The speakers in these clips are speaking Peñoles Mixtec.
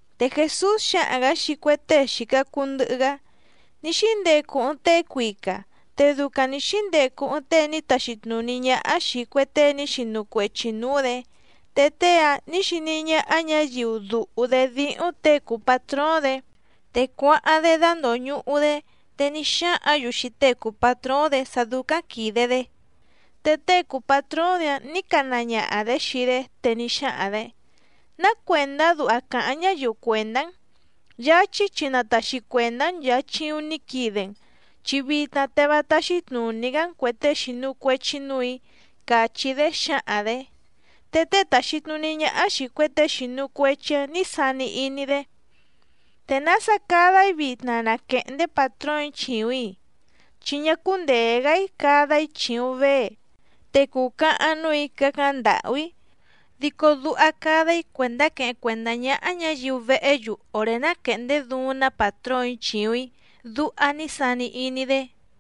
Te Jèsús xáhaⁿ‑gǎ xii cue tée xìca cuu ndɨhɨ‑gá: —Ní xíndecu ɨɨⁿ tée cuica, te ducaⁿ nǐ xíndecu ɨɨⁿ tée ní taxi tnùní ñáhá xìi cue tée ní xinu cuechi nǔú‑dě. Te tée‑áⁿ nǐ xiní ñáhá ñǎyiu dùhu‑dé díhúⁿ těe cùu patróóⁿ‑dě, te cuáháⁿ‑dé dándòñuhu‑dé, te ní xáhǎⁿ‑yu xii tée cùu patróóⁿ‑dě sá dúcáⁿ quìde‑dé. Te tée cùu patróóⁿ‑dě‑áⁿ nǐ cana ñaha‑dě xii‑dé, te ní xáhaⁿ‑dě: “¿Ná cuèndá duha càháⁿ ñáyiu cuèndá‑n? Yáchí chi na tàxi cuendá‑n nchàa chiuⁿ ní quide‑n, chi vitna te vá táxí tnùní‑gá‑n cuè tée xìnu cuechi núù‑í”, càchí‑dé xǎhaⁿ‑dě. Te tée tàxi tnuní ñáhá xìi cue tée xìnu cuechi‑áⁿ nǐ sani iní‑dé: “¿Te nása cada‑í vitna na quèhndé pàtróòⁿ‑í chìuⁿ‑í? Chi ñá cúndèe‑gá‑í cada‑í chìuⁿ vée, te cùcahaⁿ núù‑í cácáⁿ ndàhú‑í. Dico duha cada‑í cuèndá queheⁿ cuèndá ñáhá ñǎyiu vehé‑yu òré ná quèhndé duuⁿ‑ná pàtróòⁿ‑í chìuⁿ‑í”, duha ní sani iní‑dé.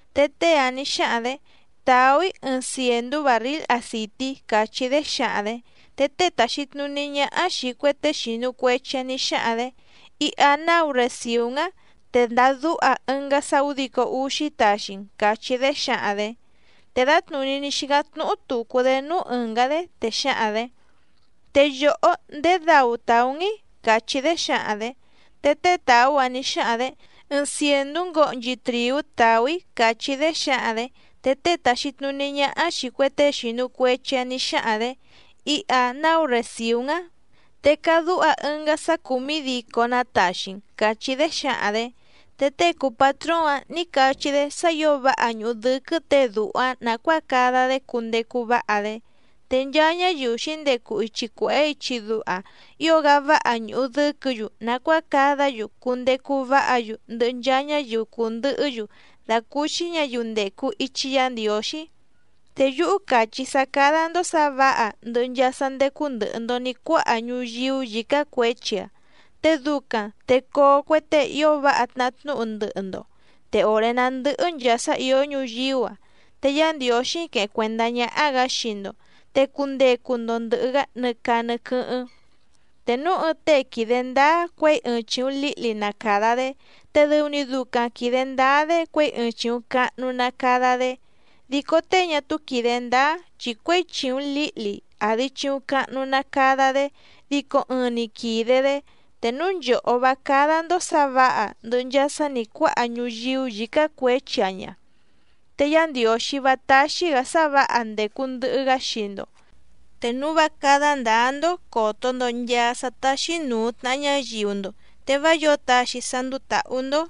Te tée‑áⁿ nǐ xáhaⁿ‑dě: “Tàú‑í ɨɨⁿ cièndú bàrríl acìtí”, càchí‑dé xǎhaⁿ‑dě. Te tée tàxi tnuní ñáhá xìi cue tée xìnu cuechi‑áⁿ nǐ xáhaⁿ‑dě: “Iha náu recìú‑n‑á, te ndadúha ɨngá sá ǔdico úxí taxi‑n”, càchí‑dé xǎhaⁿ‑dě. Te dǎtnùní ní xícáⁿ tnúhú tùcu‑dé núú ɨ̀ngá‑dé, te xǎhaⁿ‑dě: “Te yòhó, ¿ndèé dau tàú‑n‑í?”, càchí‑dé xǎhaⁿ‑dě. Te tée tàú‑áⁿ nǐ xáhaⁿ‑dě: “Ɨɨⁿ cièndú ngohnchi trìú tàú‑í”, càchí‑dé xǎhaⁿ‑dě. Te tée tàxi tnuní ñáhá xìi cue tée xìnu cuechi‑áⁿ nǐ xáhaⁿ‑dě: “Iha náu recìú‑n‑á, te cadúha ɨngá sá cùmídícó‑nǎ taxi‑n”, càchí‑dé xǎhaⁿ‑dě. Te tée cùu patróóⁿ‑áⁿ nǐ cachí‑dé sá ǐo váha ñùhu dɨ́quɨ́ těe dùhu‑áⁿ nàcuáa cada‑dé cundecu váha‑dé. Te nchaa ñáyiu xǐndecu ichi cuèhé ichi duha, ío‑gá váha ñùhu dɨ́quɨ̌‑yu nàcuáa cadá‑yu cundecu váha‑yu ndɨhɨ nchaa ñáyiu cùndɨhɨ́‑yu dàcúúxí ñǎyiu ndècu ichi Yá Ndiǒxí. ’Te yúhú càchí‑í sá cádá‑ndó sǎ vǎha ndɨhɨ nchaa sá ndécú ndɨ̀hɨ‑ndo ní cuáha ñuyíú yǐcá cuěchi‑a, te ducaⁿ te coo cue tée ío váha tnahá tnúhu ndɨhɨ‑ndo, te òré ná ndɨ̀hɨ nchaa sá ìó ñuyíú‑a, te Yá Ndiǒxí queheⁿ cuèndá ñáhá‑gǎ xii‑ndo, te cundecu‑ndo ndɨ̀hɨ‑gá nɨ caa nɨ quɨ́hɨ́ⁿ. ’Te núu ɨɨⁿ tée quìde ndáá cuěi ɨɨⁿ chìuⁿ líhli na càda‑dé, te dɨu‑ni ducaⁿ quìde ndáá‑dé cuěi ɨɨⁿ chìuⁿ cahnu na cada‑dé. Dico tée ñá túú quìde ndáá, chi cuěi chìuⁿ líhli àdi chiuⁿ cahnu na cada‑dé dico ɨɨⁿ‑ni quìde‑dé. Te núu nchòhó vá cádá‑ndó sǎ vǎha ndɨ̀hɨ nchaa sá nǐ cuáha ñuyíú yǐcá cuěchi‑a ña, te Yá Ndiǒxí vá táxí‑gǎ sá vǎha ndècu ndɨhɨ‑gá xii‑ndo. Te núu vá cádá ndǎá‑ndó còto‑ndo nchaa sá táxí nùu tnaha ñáyiu‑ndo, te vá yǒo taxi sá ndúú tàhú‑ndó.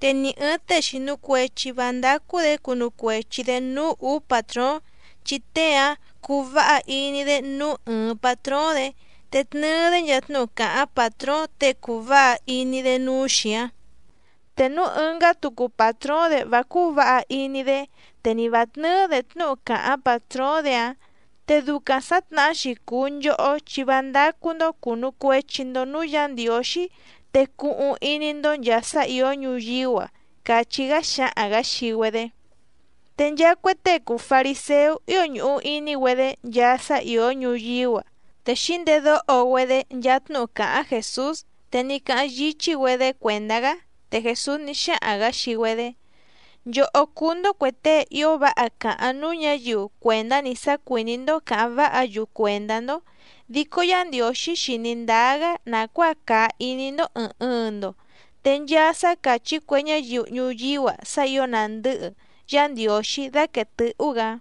’Te ni ɨ̀ɨⁿ tée xìnu cuechi vá ndácú‑dě cunu cuechi‑dě núú ǔú pàtróóⁿ, chi tée‑áⁿ cuu váha iní‑dé núú ɨɨⁿ pàtróóⁿ‑dě te tnɨɨ‑dé nchaa tnúhu càháⁿ pàtróóⁿ těe cùu váha iní‑dé núú‑xi‑áⁿ. Te núú ɨ̀ngá tucu pàtróóⁿ‑dě vá cúú vǎha iní‑dé, te ni vǎ tnɨ́ɨ́‑dě tnúhu càháⁿ pàtróóⁿ‑dě‑áⁿ. Te ducaⁿ sǎtnahá‑xi cùu nchohó chi vá ndácú‑ndó cùnu cuechi‑ndo núú Yǎ Ndiǒxí te cuhuⁿ iní‑ndó nchàa sá ìó ñuyíú‑a —càchí‑gá xáhaⁿ‑gǎ xii‑güedé. Te nchaa cue tée cùu fariséú ío ñùhu iní‑güedé nchaa sá ìó ñuyíú‑a, te xǐndedóho‑güedé nchaa tnúhu càháⁿ Jèsús, te ní cáháⁿ yíchí‑güedé cuèndá‑gá. Te Jèsús ní xáhaⁿ‑gǎ xii‑güedé: —Nchòhó cúú‑ndó cuè tée ío váha càháⁿ núú ñǎyiu cuèndá‑ni sá cuìní‑ndó cǎháⁿ váha‑yu cuèndá‑ndó, dico Yá Ndiǒxí xìní ndáá‑gá nàcuáa càa iní‑ndó ɨ̀ɨⁿ ɨɨⁿ‑ndo, te nchaa sá càchí cue ñáyiu ñuyíú‑a sá ǐo nàndɨ́hɨ, Yá Ndiǒxí dáquèe tɨ́hú‑gǎ.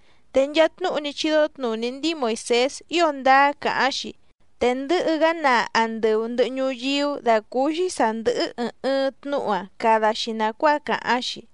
Te nchaa tnúhu ní chídó tnùní ndíi Moìsés ío ndáá càháⁿ‑xi, te ndɨ̌hɨ‑gá naa andɨu ndɨ̀hɨ ñuyíú dàcúúxí sǎ ndɨ́hɨ́ ɨ̀ɨⁿ ɨɨⁿ tnúhu‑áⁿ cada‑xi nàcuáa càháⁿ‑xi.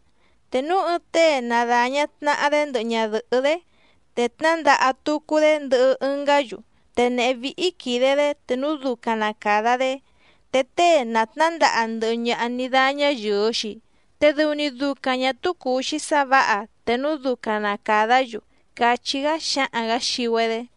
’Te núu ɨɨⁿ tée na dàña tnaha‑dé, ndɨhɨ ñadɨ̀hɨ́‑dé, te tnándaha tucu‑dé ndɨhɨ ɨngá‑yu, te nèhé víhí quìde‑dé te núu ducaⁿ na càda‑dé, te tée na tnǎndaha ndɨhɨ ñaha ní dáñá yɨ̀ɨ‑xi, te dɨu‑ni ducaⁿ ñà túú cùu‑xi sá vǎha te núu ducaⁿ na càdá‑yu —càchí‑gá xáhaⁿ‑gǎ xii‑güedé.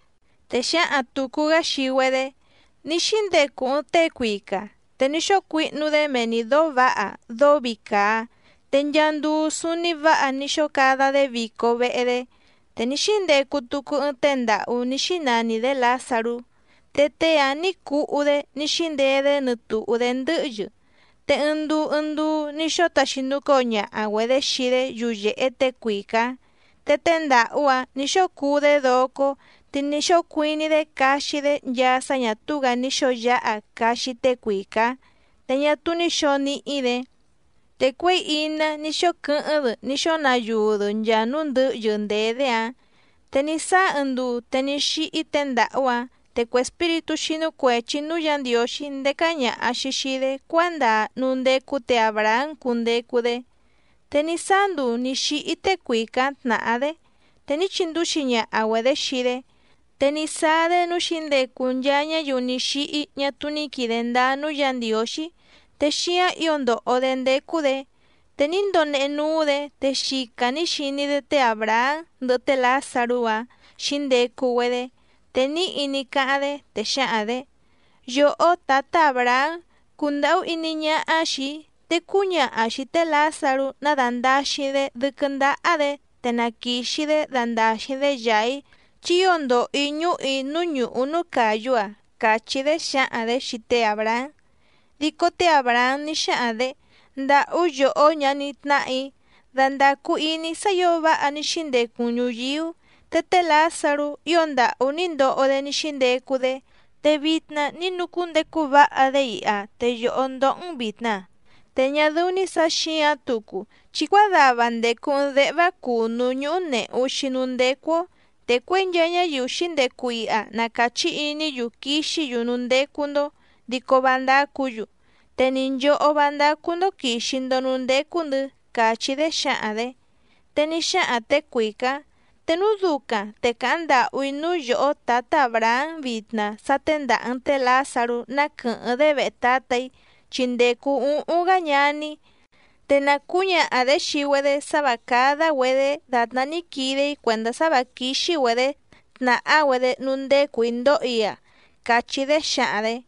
Te xǎhaⁿ tùcu‑gá xii‑güedé: —Ní xíndecu ɨɨⁿ tée cuica, te ní xóo cuihnu‑dé mee‑ni dǒó vǎha dóó vii càa, te nchaa nduu súúní vǎha ní xóo cada‑dé vico vehe‑dé. Te ní xíndecu tucu ɨɨⁿ tée ndàhú ní xínani‑dě Lǎzarú, te tée‑áⁿ nǐ cuhú‑dé ní xíndeé‑dé nɨtùhú‑dé ndɨ́hyɨ, te ɨɨⁿ nduu ɨɨⁿ nduu ní xóo taxinucóo ñaha‑güedě xii‑dé yuyèhe tée cuica‑ǎⁿ. Te tée ndàhú‑áⁿ nǐ xóo cuú‑dé docó, te ní xóo cuiní‑dé caxi‑dé nchaa sá ñà túú‑gǎ ní xǒo yáha caxi tée cuica‑ǎⁿ, te ñá túú ní xǒo níhí‑dě. Te cuěi iná ní xóo quɨ́hɨ́ⁿ‑dɨ ní xóo nayuu‑dɨ nchaa núú ndɨ̌hyɨ ndèé‑dé‑áⁿ. Te ní sáá ɨɨⁿ nduu te ní xíhí tée ndàhú‑áⁿ, te cue espíritú xínú cuèchi núú Yǎ Ndiǒxí ndécá ñàha‑xi xii‑dé cuándaa núú ndécú tě Àbrahám cundecu‑dé. Te ní sáá nduu nǐ xíhí tée cuica‑ǎⁿ tnàhá‑dé, te ní chindúxi ñaha‑güedě xii‑dé. Te ní sáá‑dé núú xǐndecu nchaa ñáyiu ní xíhí ñá túú ní quìde ndáá núú Yǎ Ndiǒxí te xíáⁿ ǐo ndòho‑dé ndécú‑dě, te ní ndonehe núú‑dě te xica nǐ xiní‑dé té Àbrahám ndɨhɨ té Lǎzarú‑áⁿ xǐndecu‑güedé. Te níhi ní cáháⁿ‑dé, te xǎhaⁿ‑dě: “Yòhó tǎtá Àbrahám, cundàhú iní ñáhá xìi‑í, te cúñaha xìi té Lǎzarú ná dàndaxiⁿ‑dé dɨ́quɨ́ ndáhá‑dě, te na quìxi‑dé dandàxiⁿ‑dé yàa‑í, chi ío ndòho‑í ñúhù‑í núú ñùhú núú càyú‑a”, càchí‑dé xǎhaⁿ‑dě xii té Àbrahám. Dico té Àbrahám ní xáhaⁿ‑dě: “Ndàhú yòhó ñaní tnáhà‑í, dandàcu iní sá ǐo váha ní xíndecu‑n ñùyíú, te té Lǎzarú ío ndàhú ní ndoho‑dé ní xíndecu‑dé. Te vitna ní nucúndecu váha‑dé iha, te yòhó ndóhó‑n vìtna. Te ñá dɨ́ú‑ní sǎ xǐǎⁿ tucu, chi cuádava ndècu ɨɨⁿ déhvá cùnú ñúhú nèhu‑xi núú ndécú‑ó, te cuěi nchaa ñáyiu xǐndecu iha na càchí iní‑yu quixí‑yu núú ndécú‑ndó dico vá ndácǔ‑yu, te ni nchòhó vá ndácú‑ndó quìxi‑ndo núú ndécú‑ndɨ̌”, càchí‑dé xǎhaⁿ‑dě. Te ní xáhaⁿ těe cuica‑ǎⁿ: “Te núu ducaⁿ te càháⁿ ndàhú‑í núú yòhó tǎtá Àbrahám vitna sá téndàha‑n té Lǎzarú ná quɨ̀hɨ́ⁿ‑dé vehe tǎtà‑í, chi ndècu úhúⁿ‑gá ñaní‑í, te na cǔñaha‑dě xii‑güedé sá vǎ cádá‑güedě dàtná ní quide‑í cuèndá sá vǎ quíxí‑güedě tnàhá‑güedé núú ndécù‑í ndóhò‑í‑a”, càchí‑dé xǎhaⁿ‑dě.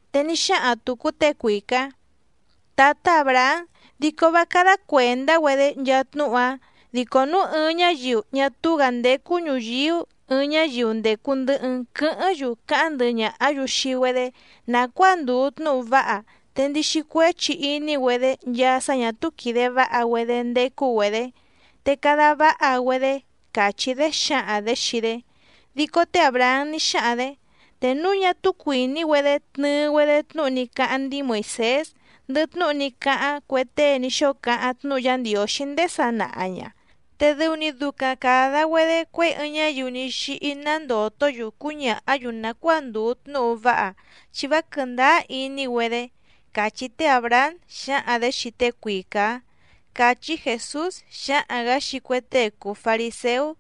Te ní xáhaⁿ tùcu tée cuica‑ǎⁿ: “Tǎtá Àbrahám, dico vá cádá cuèndá‑güedé nchaa tnúhu‑áⁿ, dico núu ɨɨⁿ ñáyiu ñá túú‑gǎ ndécú ñùyíú ɨɨⁿ ñáyiu ndècu ndɨhɨ‑n quɨ́hɨ́ⁿ‑yu cáháⁿ ndɨhɨ ñàhá‑yu xii‑güedé nàcuáa ndùu tnúhu váha, te ndixi cuéchi iní‑güedé nchaa sá ñà túú quìde váha‑güedé ndécú‑güedě, te cada váha‑güedé”, càchí‑dé xǎhaⁿ‑dě xii‑dé. Dico té Àbrahám ní xáhaⁿ‑dě: “Te núu ñá túú cuìní‑güedé tnɨɨ‑güedé tnúhu ní cáháⁿ ndíi Moìsés, ndɨhɨ tnúhu ní cáháⁿ cue tée ní xóo cáháⁿ tnúhu Yá Ndiǒxí ndéé sanaha ña, te dɨu‑ni ducaⁿ càda‑güedé cuěi ɨɨⁿ ñáyiu ní xíhí ná ndòtó‑yu cúñàhá‑yu nàcuáa ndùu tnúhu váha, chi vá quɨ̀ndáá iní‑güedé”, càchí té Àbrahám xǎhaⁿ‑dě xii tée cuica‑ǎⁿ —càchí Jèsús xáhaⁿ‑gǎ xii cue tée cùu fariséú.